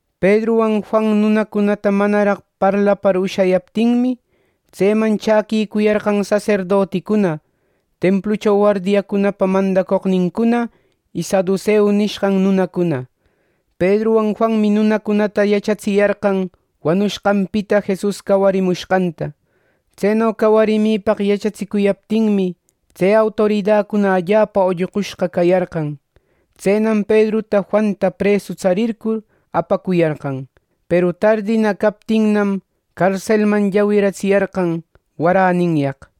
Pedruwan Juan nunacunata manaraq parlapar ushayaptinmi, tseman chäquicuyarqan saserdoticuna, templucho wardiacunapa mandacoqnincuna y saduseu nishqan nunacuna. Pedruwan Juanmi nunacunata yachatsiyarqan wanushqanpita Jesus cawarimushqanta. Tseno cawarimipaq yachatsicuyaptinmi, tse autoridacuna allapa ollqushqa cayarqan. Tsenam Pedruta Juanta presu tsarircur, apacuyarqan. Peru tardinna captinnam, carselman llawiratsiyarqan waräninyaq.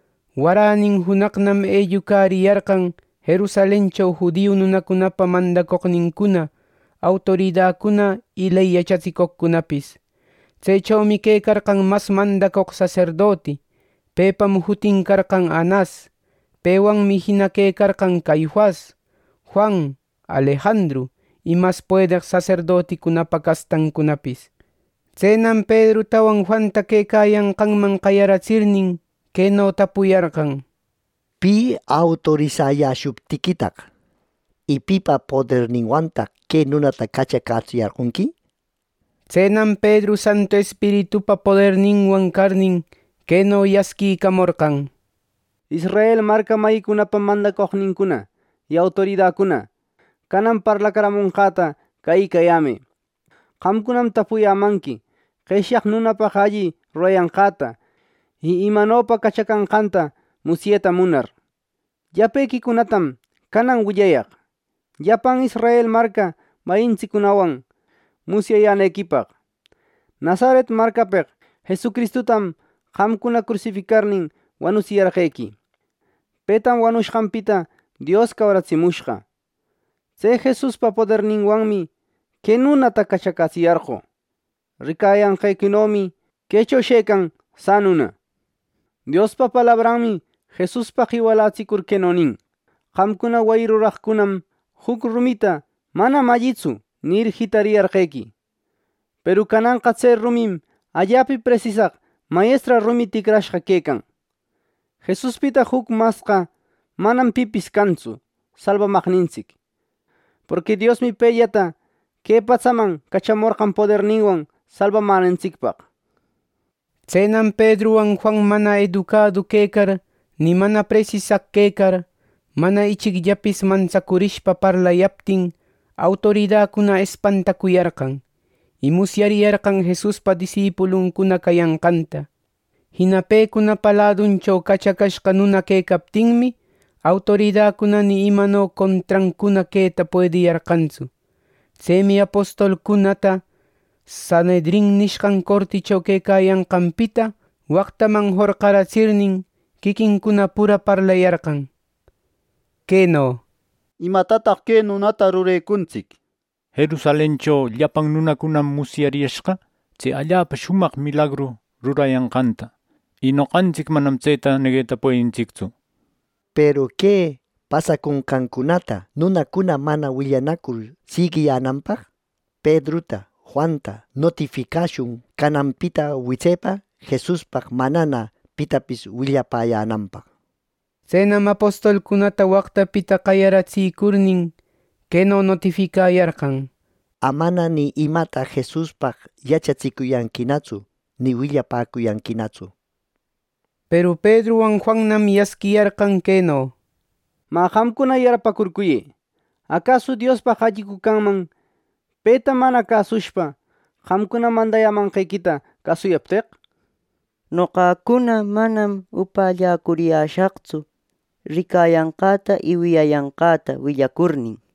Waränin junaqnam ellucariyarqan Jerusalencho judio nunacunapa mandacoqnincuna, autoridacuna y ley yachatsicoqcunapis. Tsechomi quecarqan mas mandacoq saserdoti; pepam jutin carqan Anas. Pewanmi jina quecarqan Caifas, Juan, Alejandru, y mas puedeq saserdotipa castancunapis. Tsenam Pedrutawan Juanta quecayanqanman qayaratsirnin, queno tapuyarqan: —¿Pi autorisayäshuptiquitaq y pipa poderninwantaq que nunata cachacätsiyarqonqui! —nishpa. Tsenam Pedru Santu Espiritupa poderninwan carnin, queno yasquicamorqan: —Israel marca mayicunapa mandacoqnïcuna y autoridacuna, canan parlacaramonqäta cäyïcayämë. Qamcunam tapuyämanqui qeshyaq nunapaq alli rurayanqäta y imanopa cachacanqanta musyeta munar. Llapequicunatam canan willayaq, llapan Israel marca mayintsiccunawan musyayänequipaq. Nazaret marcapeq Jesucristutam qamcuna crusificarnin, wanutsiyarqequi. Petam wanushqanpita Dios cawaritsimushqa. Tse Jesuspa poderninwanmi que nunata cachacätsiyarqö. Ricayanqequinomi quecho shëcan sanuna. Diospa palabranmi Jesuspaq iwalatsicur queno nin: Qamcuna wayi ruraqcunam juc rumita, “manam allitsu” nir, jitariyarqequi; peru cananqa tse rumim allapa presisaq mayestra rumi ticrarishqa quecan. Jesuspita juc masqa manam pipis cantsu salbamaqnintsic. Porqui Diosmi pellata que patsaman cachamorqan poderninwan salbamänantsicpaq. Tsenam Pedruwan Juan mana educadu quecar ni mana presisaq quecar, mana ichicllapis mantsacurishpa parlayaptin, autoridacuna espantacuyarqan. Y musyariyarqan Jesuspa disipuluncuna cayanqanta. Jina pecunapa laduncho cachacashqa nuna quecaptinmi, autoridacuna ni imanopa contrancuna queta puediyarqantsu. Tsemi apostolcunata Sanhedrin nishqan corticho quecayanqanpita waqtaman jorqaratsirnin, quiquincuna puralla parlayarqan queno: —¿Imatataq que nunacunata rurecuntsic? Jerusalencho llapan nunanam musyariyashqa tse allapa shumaq milagru rurayanqanta. Y noqantsic manam tseta negueta puedintsictsu. Peru que pasaconqancunata nunacuna mana willanacur siguiyänanpaq, Pedruta Juanta notificashun cananpita witsepa Jesuspaq manana pitapis willapäyänanpaq —nir. Tsenam apostolcunata waqtapita qayaratsicurnin, queno notificayarqan: —¡Amana ni imata Jesuspaq yachatsicuyanquinatsu, ni willapäcuyanquinatsu! —nir. Peru Pedruwan Juannam yasquiyarqan queno: —Mä, qamcuna yarpäcurcuyë. ¿Acasu Diospaq allicu canman, peta mana cäsushpa, qamcuna mandayämanqequita cäsuyapteq! Noqacuna manam upälläcuriyäshaqtsu, ricayanqäta y wiyayanqäta willacurnin —nir.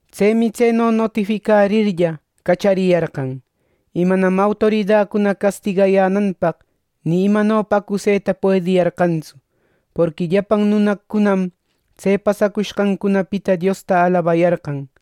Tsemi tseno notificarirlla, cachariyarqan. Y manam autoridacuna castigayänanpaq ni imanopa acuseta puediyarqantsu. Porqui llapan nunacunam tse pasacushqancunapita Diosta alabayarqan.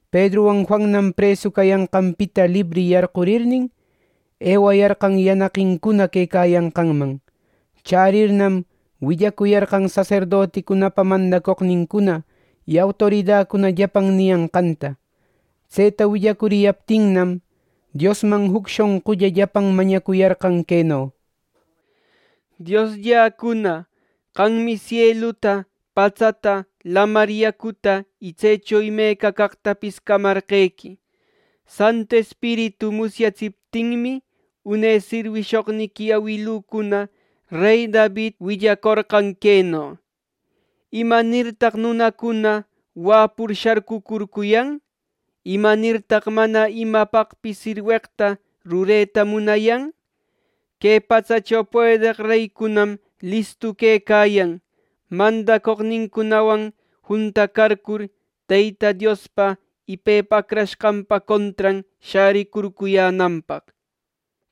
Pedruwan Juannam presu cayanqanpita libri yarqurirnin, ewayarqan yanaqincuna quecayanqanman. Chärirnam, willacuyarqan saserdoticunapa mandacoqnincuna y autoridacuna llapan niyanqanta. Tseta willacuriyaptinnam, Diosman juc shonqulla llapan mañacuyarqan queno: —Dioslläcuna, qammi sieluta, patsata, lamar yacuta y tsecho imeca caqtapis camarqequi. Santu Espiritu musyatsiptinmi, une sirwishoqniqui awilücuna rey David willacorqan queno: ‘¿Imanirtaq nunacuna wäpur sharcucurcuyan? ¿Imanirtaq mana imapaqpis sirweqta rureta munayan? Que patsacho puedeq reycunam listu quecayan, mandacoqnincunawan juntacarcur, Teyta Diospa y Pepa Acrashqanpa contran shäricurcuyänanpaq’ nir.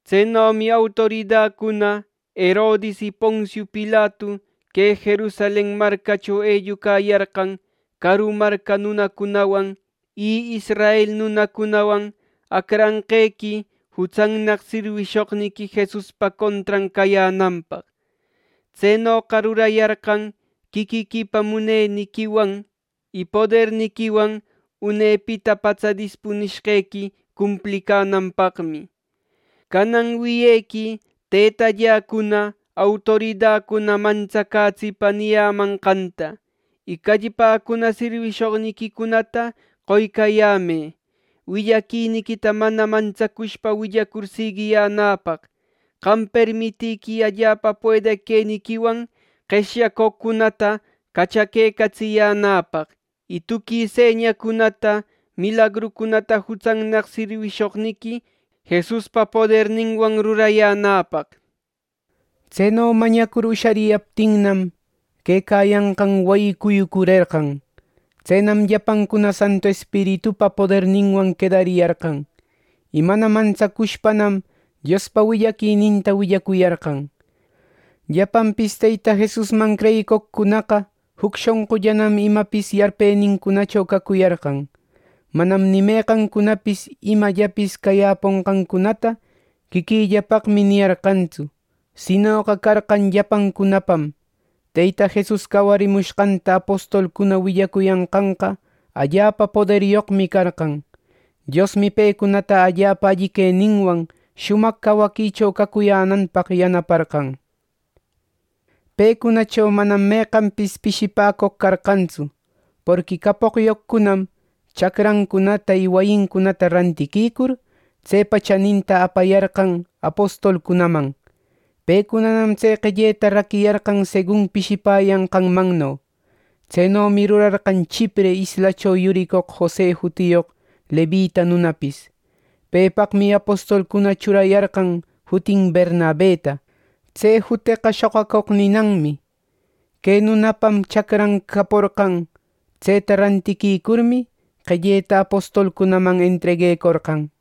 “Tsenomi autoridacuna Herodis y Poncio Pilatu que Jerusalen marcacho ellucayarqan caru marca nunacunawan y israel nunacunawan, acranqequi jutsannaq sirwishoqniqui Jesuspa contran cayänanpaq. Tsenoqa rurayarqan quiquiquipa muneniquiwan y poderniquiwan unepita patsa dispunishqequi cumplicänanpaqmi. Canan wiyequi, tëtalläcuna, autoridacuna mantsacätsipa niyämanqanta. Y callpäcuna sirwishoqniquicunata qoycäyämë, willaquiniquita mana mantsacushpa willacur siguiyänäpaq. Qam permitïquï allapa puedeq queniquiwan qeshyacoqcunata cachaquecatsiyänäpaq, y tuqui señacunata milagrucunata jutsannaq sirwishoqniqui Jesuspa poderninwan rurayänäpaq” nir. Tseno mañacur ushariyaptinnam, quecayanqan wayi cuyucurerqan. Tsenam llapancuna Santu Espiritupa poderninwan quedariyarqan. Y mana mantsacushpanam Diospa willaquininta willacuyarqan. Llapanpis Teyta Jesusman creyicoqcunaqa juc shonqullanam imapis yarpenincunacho cacuyarqan. Manam ni meqancunapis imallapis cayäponqancunata “quiquilläpaqmi” niyarqantsu; sinoqa carqan llapancunapam. Teyta Jesus cawarimushqanta apostolcuna willacuyanqanqa allapa poderyoqmi carqan. Diosmi pecunata allapa alli queninwan shumaq cawaquicho cacuyänanpaq yanaparqan. Pecunacho manam meqanpis pishipäcoq carqantsu. Porqui capoqyoqcunam, chacrancunata y wayincunata rantiquicur, tsepa chaninta apayarqan apostolcunaman. Pecunanam tse qelleta raquiyarqan segun pishipäyanqanmanno. Tsenomi rurarqan Chipre islacho yuricoq Jose jutiyoq levita nunapis. Pepaqmi apostolcuna churayarqan jutin Bernabeta. (Tse juteqa “shoqacoq” ninanmi.) Que nunapam chacran caporqan. Tseta rantiquicurmi, qelleta apostolcunaman entreguecorqan.